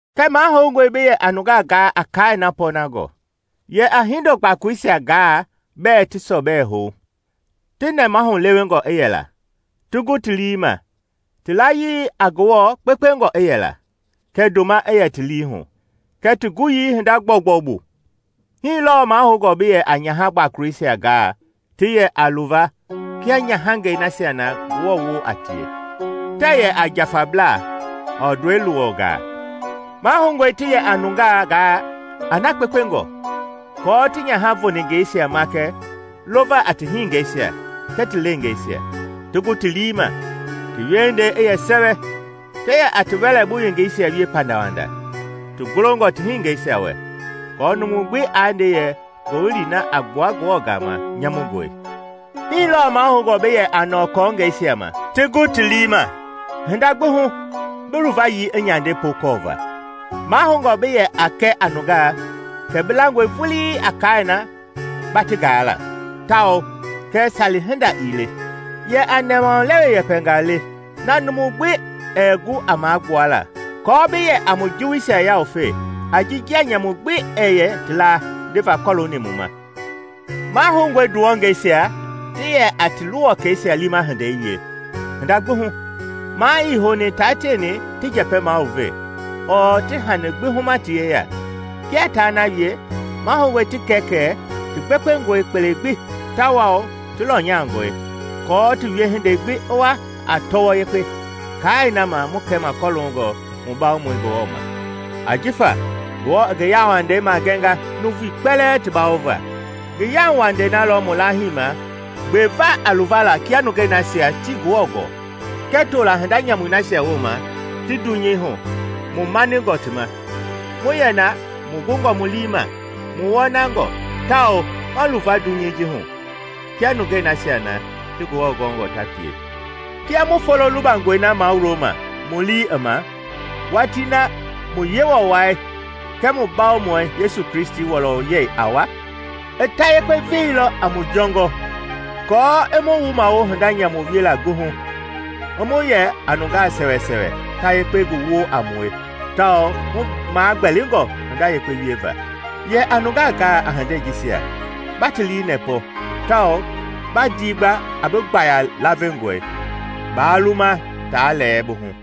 Kɛɛ mahoungɔe bi yɛ a nungaa gaa a kaai na pɔɔnangɔ. Yɛ a hindo gbakoloisia gaa bɛɛ ti sɔbɛ hou, ti nɛmahu lewengɔ i yɛla, ti gu ti lii ma; ti layii a Ngewɔ gbekpengɔ i yɛla, kɛɛ ndoma i yɛ ti liihu, kɛɛ ti guyii hinda gbɔugbɔu bu. Hii lɔɔ mahoungɔ bi yɛ a nyaha gbakoloisia gaa ti yɛ a luva kia nyahangɛi nasia na Ngewɔ woo a tie. Tɛɛ yɛ a njafablaa, ɔɔ ndɔi luwɔngaa. Mahoungɔe ti yɛ a nungaa gaa a na kpekpengɔ, aako ti nyaha voningeisia makɛ lova a ti hiningɛisia kɛɛ ti leengeisia, ti gu ti lii ma, ti wiehindei i yɛ sɛwɛ, ti yɛ a ti wɛlɛbu yengeisia wie pandawanda, ti golongɔ ti hiningɛisia wɛ, aako numu gbi aa nde yɛ ngowili na a gbua Ngewɔ gama nyamungɔe. Hii lɔɔ mahoungɔ bi yɛ a nɔɔ kɔɔngɛisia ma ti gu ti lii ma. Hinda gbi hu bi luvayii i nyande pookɔɔva. Mahoungɔ bi yɛ a kɛ a nungaa kɛ bi langɔe vulii a kaai na ba ti gaa la tawao kɛ sali-hinda ii le. Yɛ a nɛmaulewe yɛpɛngaa le, na numu ɛɛ gu a magbuala, aako bi yɛ a mu juwuisia yawufe a ji njia nyamu gbi ɛɛ yɛ ti laa ndeva kɔlooni mu ma. Mahoungɔe nduwɔngeisia ti yɛ a ti luwɔkɛisia liima hindei wie hinda gbi hu. Maa ii houni taa tieni ti njɛpɛ maluve, ɔɔ ti hani gbi huma ti yeya. Kia taa na wie, mahoungɔe ti kɛ kɛ ti gbekpengɔe kpele gbi tawao ti lɔnyangɔ, aako ti wiehindei gbi i wa a tɔwɔ yekpe kaai na ma mu kɛma kɔloongɔ mu Bawomɔi Ngewɔ ma. Ajifa Ngewɔ i ngi yauwandei magɛnga nuuvui kpɛlɛɛ ti bawova. Ngi yauwandei na lɔ mu laahima gbeva a luvala kia nungei nasia tii Ngewɔ gɔɔ kɛɛ toola hinda nyamui nasia wooma ti dunyei hu mu maningɔ ti ma, mu yɛ na mu gungɔ mu lii ma, mu wɔnangɔ, tawao ma luva dunyei ji hu kia nungei nasia ti Ngewɔ gɔɔngɔ ta pie, kia mu Folo lubangɔi na mawuloma mu lii i ma, watii na mu Yewɔ wai kɛɛ mu Bawomɔi Yesu Kristi wɔlɔyɛi a wa. I ta yekpe veilɔ a mu jɔngɔ, kɔɔ i mu wumawo hinda nyamu wiela gbi hu, i mu yɛ a nungaa sɛwɛsɛwɛ ta yakpe ngi woo a mue tawao mu magbɛlingɔ hinda yekpe wieva. Yɛ a nungaa gaa a hindei jisia ba ti liinɛpɔ tawao ba ndigba a bi gbaaya lavengɔi. Baa luma taa lɛɛ bi hu.